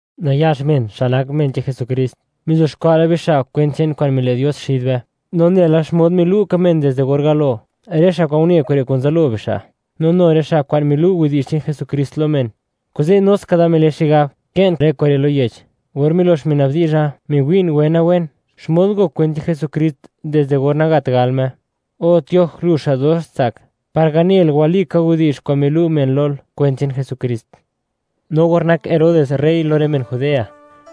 Nayax men, xa' nak men che'n Jesukrist, mizuxkwa' la bixa' kwent che'n kwa'n mile' Dios xid be, no nela xmod milu' ka men dizde or galo, rë xa' kwa'n une kure' kun zalo bixa', no nu rë xa' kwa'n milu' widi'zh che'n Jesukrist lo men. Kuze', nu ska da mile xigab kë'n rë kure' lo yech, or milox mina'b dizha, miwi'n wena-wen, xmod ngok kwent che'n Jesukrist, dizde or nagat gal Me, O Tioj, lu xa' dox tsak, par ganel, walika widi'zh kwa'n milu' men lol, kwent che'n Jesukrist. No or nak Herodes rey lo rë men Judea,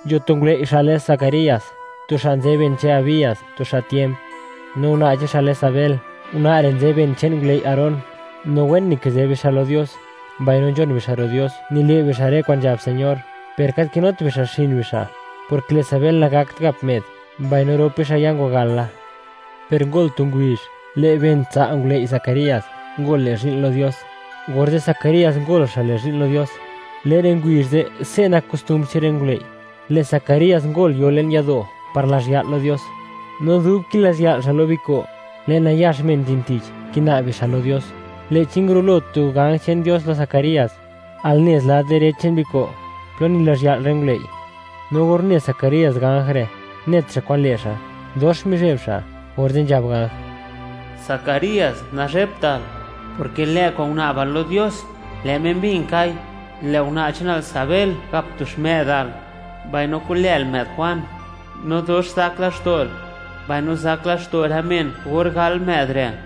nzho tu ngulëi' xa' lë Zacarías, tu xa' nzë ben che'n Abías, tu xa' tiemp. No una' che'n xa' lë Sabel, una' re' nzë ben che'n ngulëi' Aarón. No wen nikizë bixa' lo Dios, mbaino nzhon bixa' ro' Dios, nile' bixa' rë kwa'n nzhab Señor. Per gat kinut bixa' xin bixa', porke lë' Sabel nagakt gap më'd, mbaino rop bixa' ya ngwagal la. Per ngol tu ngubizh, lë' ben tsa' ngulëi' Zacarías ngol, le' zhi'n lo Dios, orze' Zacarías ngol xa' le' zhi'n lo Dios. Le'n rë ngubizh ze', se' nak kostumbr che'n rë ngulëi', lë' Zacarías ngol yo le'n yado', par lazh ya'l lo Dios. No dub kilazhya'l xa' lo biko', lë' nayax men nzhin tich, kina'b bixa' lo Dios. Lë'chi ngurulo tu ganj che'n Dios lo Zacarías, al nez lad direch che'n biko' plo nilazhya'l rë ngulëi'. No or une Zacarías ganj re', net xa' kwan le' xa', dox mizheb xa'. Orze' nzhab ganj: ―Zacarías, nazhebtal, porke lë' kwa'n guna'bal lo Dios, lë' Me mbin kai, lë' una' che'nal Sabel gap tu xmë'dal, mbaino ku'lël më'd Juan, no dox zak laxto'l, mbaino zak laxto' rë men, or gal më'd re',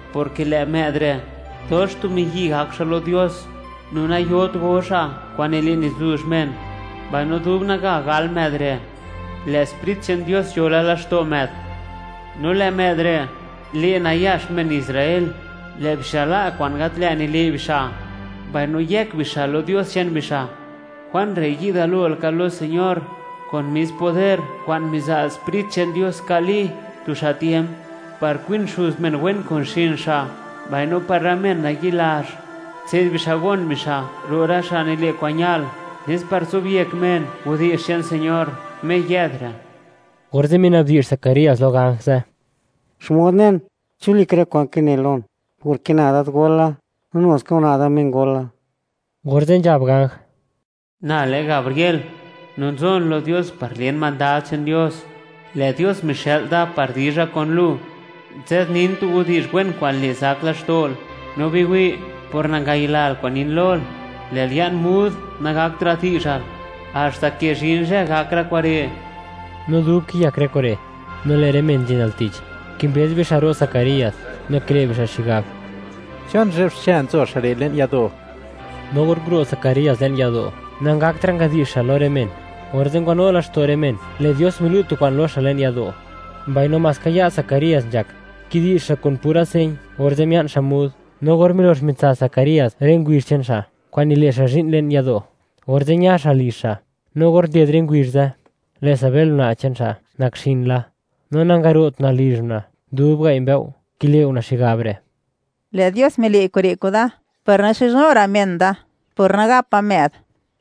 porke lë' më'd re', dox tu miyi' gak xa' lo Dios, no nayot go xa' kwa'n nile' nizuzh men, mbaino dub naga gal më'd re', lë' Sprit che'n Dios nzho la laxto' më'd. No lë' më'd re', le' nayax men Israel, lë' bixa' la' kwa'n gat lë't nile' bixa', mbaino yëk bixa' lo Dios che'n bixa'. Juan re' yi'd galo laka lo Señor kun mis poder kwa'n miza' Sprit che'n Dios nka' Li, tu xa' tiemp, par kwin xuz men wen kun xin xa', mbaino par rë men nayi' lazh, tse'd bixa' gon bixa' ro' rë xa' nile' kwa'n ñal, nes par zobyek men widi'zh che'n Dios, Me yë'd re'. Orze' minabdi'zh Zacarías lo ganj ze': ―¿Xmod nen chi walika rë kwa'n kinel lon? Porke na dadgol la, no nu ska una' da mengol la. Orze' nzhab ganj: ―Na lë Gabriel, no nzon lo Dios par len mandad che'n Dios. Lë' Dios mixë'l da par dizha kulu, nzadnin tu widi'zh wen kwa'n le' zak laxto'l. No biwi', por nangayilal kwa'n nin lol, lë'l ya'n mud, nagaktra' di'zhal, haxta ke zhin zhë gak rë kure'. No dub kiyak rë kure', no lë' rë men nzhin al tich kimbëz bixa' ro' Zacarías, no kile' bixa' xigab: “¿Chon zhe'b xche nzho xa' re' le'n yado'?” No or nguro' Zacarías le'n yado', nangaktra' ngadi'zh xa' lo rë men. Orze' ngwanu laxto' rë men, lë' Dios milu' tu kwa'n lo xa' le'n yado', mbaino maska ya' Zacarías nzhak, kidi'zh xa' kun pura señ, orze' mia'n xa' mud. No or milox mitsa Zacarías rë ngubizh che'n xa' kwa'n nile' xa' zhi'n le'n yado', orze' ña xa' lizh xa'. No or nded rë ngubizh ze', lë' Sabel, una' che'n xa' nak xin la, no nangaro't una' lizh una' dub gai' mbëo', kile' una' xigab re': “Lë' Dios mile' kure' kuda, par naxizhnu ra' men da, por nagapa më'd.”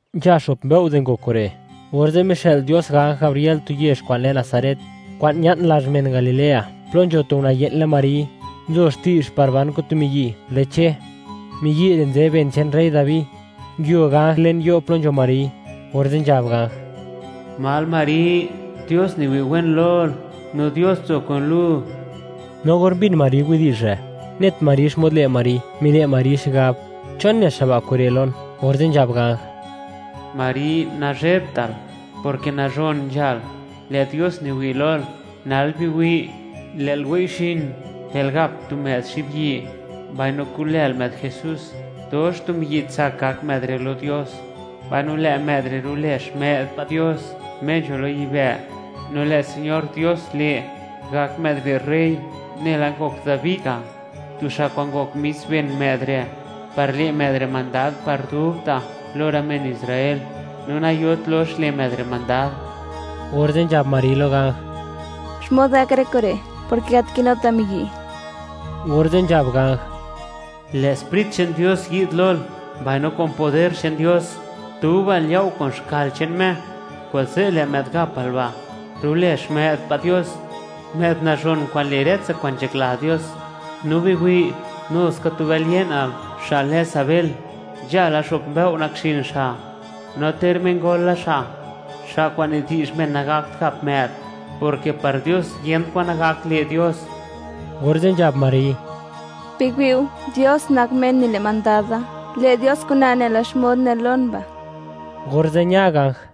Nzha xo'p mbëo' di ngok kure', orze' mixë'l Dios ganj Gabriel tu yezh kwa'n lë Nazaret, kwa'n ña'n lazh men Galilea, plo nzho tu una' ye'n lë Mari, nzo xti'zh par ban kun tu miyi' lë Che; miyi' re' nzë ben che'n rey Dabi. Nguio ganj le'n yo' plo nzho Mari, orze' nzhab ganj: ―¿Mal Mari? ¡Dios niwi' wen lol, no Dios nzo kun lu! No or mbin Mari widi'zh re', net Mari xmod le' Mari, mile' Mari xigab: “¿Chon ne xa' ba' kure' lon?” Orze' nzhab ganj: ―Mari, nazhebtal, porke nazhon nzhal, lë' Dios niwi' lol. Nal biwi', lë'l wei'xin, lë'l gap tu më'd xibyi', mbaino ku'lël më'd JESÚS. Dox tu miyi' tsak gak më'd re' lo Dios, mbaino lë' më'd re' rulë Xmë'd pa' Dios, Me nzho lo yibë', no lë' Señor Dios le', gak më'd re' rey, nela ngok Dabi ga', tu xa' kwa'n ngok mis ben më'd re'; par le' më'd re' mandad par dubta' lo rë men Israel, no nayot lox le' më'd re' mandad. Orze' nzhab Mari lo ganj: ―¿Xmod gak kure', porke gat kinuta' miyi'? Orze' nzhab ganj: ―Lë' Sprit che'n Dios yi'd lol, mbaino kun poder che'n Dios, dubal yao' kun xkal che'n Me, kuze' lë' më'd gapal ba', rulë Xmë'd pa' Dios, më'd nazhon kwa'n le' rë tsa kwa'n nzhakla Dios. No biwi', nu ska tu bël ye'nal, xa' lë Sabel, nzha la xo'p mbëo' nakxin xa', no ter mengol la xa', xa' kwa'n nidi'zh men nagakt gap më'd, porke par Dios, yent kwan nagak le' Dios. Orze' nzhab Mari: ―Biwi' go, Dios nak Me nile' mandad da; le' Dios kuna nela xmod nel lon ba'. Orze' ña ganj.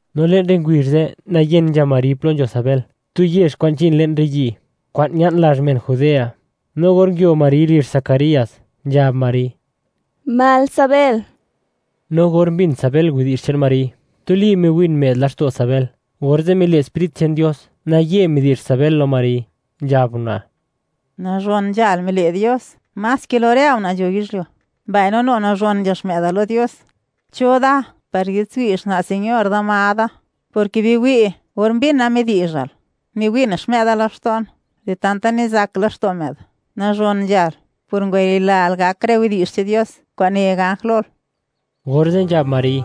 No le'n rë ngubizh ze', nayen nzha Mari plo nzho Sabel, tu yezh kwa'n nzhin le'n rë yi', kwa'n ña'n lazh men Judea. No or nguio Mari lizh Zacarías, nzhab Mari: ―¿Mal, Sabel? No or mbin Sabel widi'zh che'n Mari, tuli miwin më'd laxto' Sabel, orze' mile' Sprit che'n Dios naye midi'zh Sabel lo Mari, nzhab una': ―Nazhon nzhal mile' Dios, más ke lo rë una' nzho yizhyuo; mbaino nu nazhon nzha xmë'dal lo Dios. ¿Cho da, par yi'dtswi' xna' Señor da, ma da?, porke biwi', or mbina midi'zhal, miwin xmë'da laxto'n di tanta nizak laxto' më'd. Nazhon nzhal, por ngwayilal gak rë widi'zh che'n Dios, kwa'n ne ganj lol. Orze' nzhab Mari: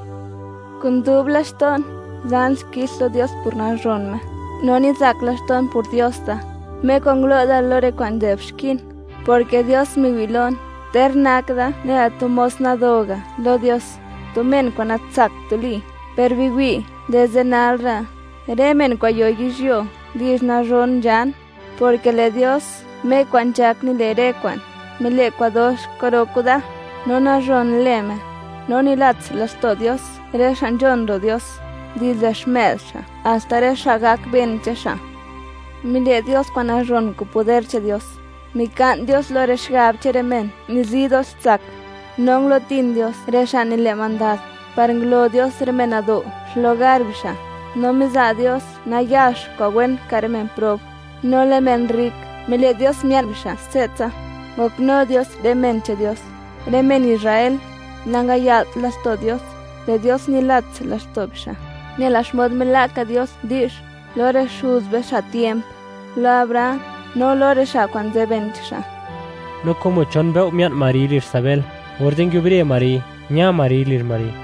Kun dub laxto'n, zan xkix lo Dios por nazhon Me, no nizak laxto'n por Dios da, Me kwa'n ngulo' da lo rë kwa'n nzë'b xkin, porke Dios miwi' lon, ter nak da nela tu mos nado ga' lo Dios, tu men kwa'n natsakt tuli. Per biwi', dizde nal ra', rë men kwa'n yo yizhyuo, di'zh nazhon nzhan, porke lë' Dios Me kwa'n nzhak nile' rë kwa'n, mile' kwa'n dox kwa'ro kuda, no nazhon lë Me. No nilats laxto' Dios rë xa' nzhon ro' Dios, dizde xmë'd xa' haxta rë xa' gak ben che'n xa'. Mile' Dios kwa'n nazhon kun poder che'n Dios. Mika'n Dios lo rë xigab che'n rë men nizi dox tsak, no ngulutin Dios rë xa' nile' mandad, par ngulo Dios rë men nado' xlugar bixa'. No miza' Dios nayax kwa'n wen ka' rë men prob, no lë' men rrik, mile' Dios mia'n bixa' se'tsa. Ngoknu Dios rë men che'n Dios, rë men Israel; nangaya'lt laxto' Dios, lë' Dios nilats laxto' bixa', nela xmod mila' ka Dios di'zh lo rë xuz be, xa' tiemp; lo Abraham, no lo rë xa' nzë ben che'n xa'. No como chon mbëo' mia'n Mari lizh Sabel, orze' nguiubre Mari, ña Mari lizh Mari.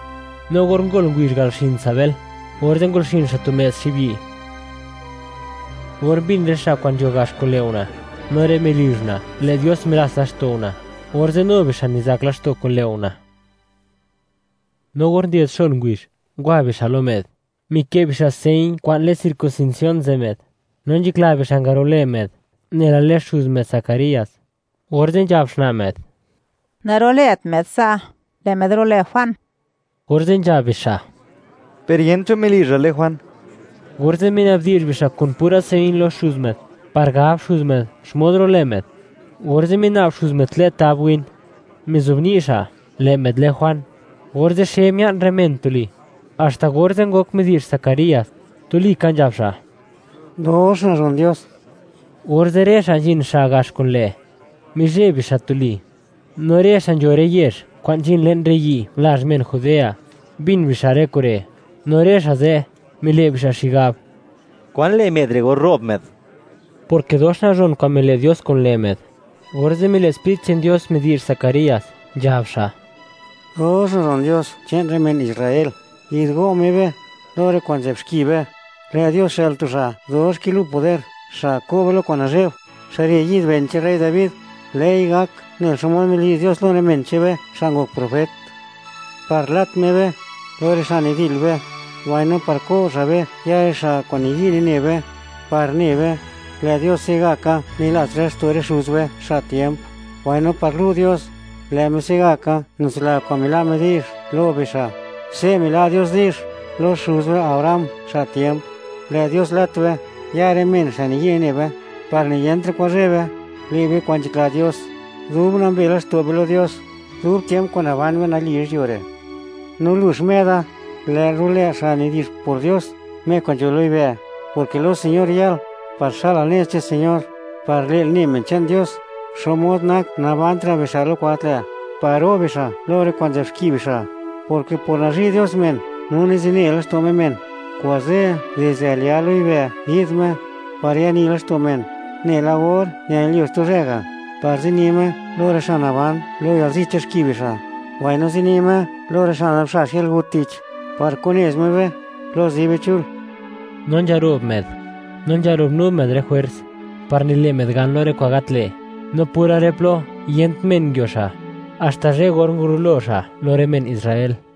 No or ngol ngubizh gal xin Sabel, orze' ngol xin xa' tu më'd xibyi'. Or mbin rë xa' kwa'n nzho gax kun lë' una', no rë melizh una', lë' Dios milats laxto' una', orze' nu bixa' nizak laxto' kun lë' una'. No or nded xon ngubizh, ngwa bixa' lo më'd, mikë' bixa' señ kwa'n lë circuncisión ze' më'd, no nzhakla bixa' ngarolë më'd nela lë xuz më'd, Zacarías. Orze' nzhab xna' më'd: ―Narulët më'd sa', lë' më'd rulë Juan. Orze' nzhab bixa': ―Per yent cho melizhal lë Juan. Orze' minabdi'zh bixa' kun pura señ lo xuz më'd, par gab xuz më'd xmod rulë më'd. Orze' mina'b xuz më'd tlë' tab win, mizobni' xa': “Lë' më'd lë Juan.” Orze' xe mia'n rë men tuli. Haxta orze', ngok midi'zh Zacarías, tuli ka nzhab xa': “¡Dox nazhon Dios!” Orze' rë xa' nzhin xa' gax kun lë', mizheb bixa' tuli, no rë xa' nzho rë yezh kwa'n nzhin le'n rë yi' lazh men Judea, mbin bixa' rë kure'. No rë xa' ze', mile' bixa' xigab: “¿Kwan le' më'd re' or ro'b më'd?”, porke dox nazhon kwa'n mile' Dios kun lë' më'd. Orze' mile' Sprit che'n Dios midi'zh Zacarías, nzhab xa': Dox nazhon Dios che'n rë men Israel, yi'dgo' Me be, lo rë kwa'n nzë'b xki be. Lë' Dios xë'l tu xa' dox kinu poder xa' ko' be lo kwa'n nazhe'b. Xa' re' yi'd ben che'n rey Dabi. Lë'i gak nela xmod midi'zh Dios lo rë men che'n be, xa' ngok profet, par lat Me be lo rë xa' nidil be, mbaino par ko' xa' be ya' rë xa' kwa'n niyi' nine be, par ne be, lë' Dios se'gaka nilats laxto' rë xuz be, xa' tiemp, mbaino par lu' Dios, lë' Me se'gaka nitsila kwa'n mila' Me di'zh lo bixa'. Se' mila' Dios di'zh lo xuz be Abraham, xa' tiemp. Lë' Dios lat be ya' rë men xa' niyi' nine be, par niyentra' kwan zheb be, le' be kwa'n nzhakla Dios, dub nambe laxto' be lo Dios, dub tiemp kwa'n naban be nali yizhyuo re'. No lu, xmë'da, lë'l rulë xa' nidi'zh por Dios, Me kwa'n nzho lo yibë', porke lo Señor yal, par xa'lal nez che'n Señor, par le'l ne men che'n Dios, xmod nak nabantra' bixa' lo kwa'n gat lë', par ro' bixa' lo rë kwa'n nzë'b xki bixa', porke por nazhi' Dios men no nizine laxto' Me men. Kuze', dizde al ya' lo yibë' yi'd Me, par yani laxto' men, nela or ñanilyuo xtu zhë ga', par zini Me lo rë xa' naban lo yalzi che'n xki bixa', mbaino zini Me lo rë xa' nazubxax yalgut tich, par ku'nez Me be plo zi be chul. No nzharo'b më'd, no nzharo'b nu më'd rë jwers, par nile' më'd gan lo rë kwa'n gat lë', no pura rë plo yent men nguio xa', haxta zhë or ngurulo xa' lo rë men Israel.